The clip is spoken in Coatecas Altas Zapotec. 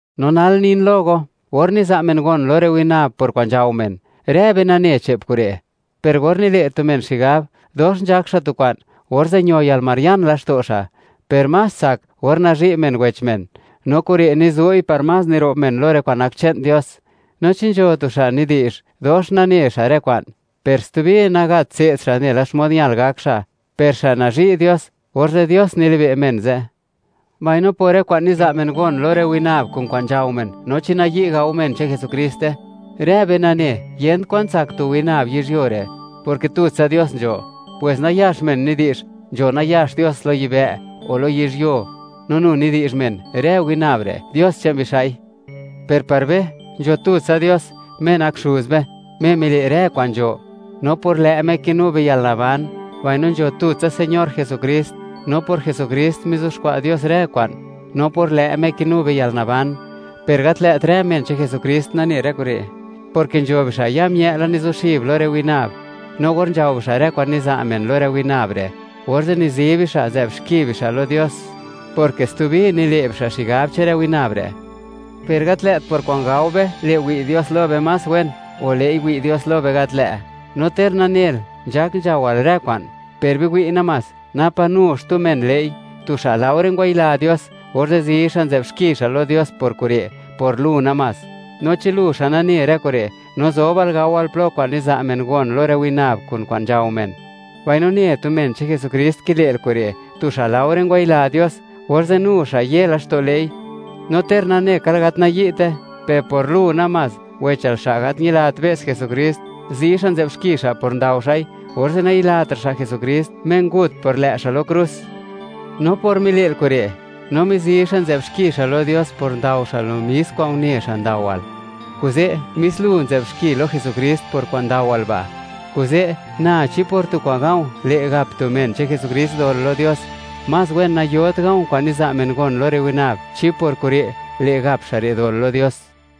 No nal, nin lo go, or niza' men gon lo rë winab por kwa'n nzhao men. Rë be nane che'p kure', per or nile' tu men xigab, dox nzhak xa' tu kwa'n, orze' ño yalmarian laxto' xa'. Per más tsak, or nazhi' men wech men, no kure' nizu'i par más niro'b men lo rë kwa'n nak che'n Dios. No chi nzho tu xa' nidi'zh, dox nane xa' rë kwa'n, per stubi nagat tse'd xa' nela xmod ñal gak xa', per xa' nazhi' Dios, orze' Dios nilibe' men ze'. Mbaino por rë kwa'n niza' men gon lo rë winab kun kwa'n nzhao men, no chi nayi' gao men che'n Jesukriste, rë be nane, yent kwa'n tsak tu winab yizhyuo re', porke tutsa Dios nzho. Pwes nayax men nidi'zh, nzho nayax dios lo yibë', o lo yizhyuo; no nu nidi'zh men, rë winab re', dios che'n bixa'i, per par be, nzho tutsa Dios, Me nak Xuz be, Me mile' rë kwa'n nzho; no por lë' Me, kinu be yalnaban. Mbaino nzho tutsa Señor Jesukrist, no por Jesukrist, mizuxkwa' Dios rë kwa'n, no por lë' Me kinu be yalnaban. Per gat lë't rë men che'n Jesukrist nane rë kure', porke nzho bixa' ya mië' la nizuxib lo rë winab, no or nzhao bixa' rë kwa'n niza' men lo rë winab re', orze' nizi bixa', nzë'b xki bixa' lo Dios, porke stubi nile' bixa' xigab, che'n rë winab re'. Per gat lë't por kwa'n gao be, le' wi' Dios lo be más wen; o le'i, wi' Dios lo be gat lë'. No ter nanel, nzhak nzhaowal rë kwa'n, per biwi' namás, napa nu xtu men le'i, tu xa' laore ngwayila Dios, orze' zi xa', nzë'b xki xa' lo Dios por kure', por lu namás. No chi lu, xa' nane rë kure', no zobal gawal plo kwa'n niza' men gon lo rë winab kun kwa'n nzhao men, mbaino ne tu men che'n Jesukrist kile'l kure', tu xa' laore ngwayila Dios, orze' nu xa' ye laxto' le'i. No ter nanekal gat nayi'te, per por lu namás, wechal xa' gat ñilat be's Jesukrist, zi xa' nzë'b xki xa' por ndao xa'i, orze' nayilatra' xa' Jesukrist, Me ngut por lë' xa' lo krus. No por mile'l kure', no mizi xa', nzë'b xki xa' lo Dios por ndao xa' lo mis kwa'n une xa' ndaowal, kuze' mis lu nzë'b xki lo Jesukrist por kwa'n ndawal ba'. Kuze', na, chi por tu kwa'n ga̱u̱ le' gap tu men che'n Jesukrist dol lo Dios, más wen nayot ga̱u̱ kwa'n niza' men gon lo rë winab, chi por kure' le' gap xa' re' dol lo Dios.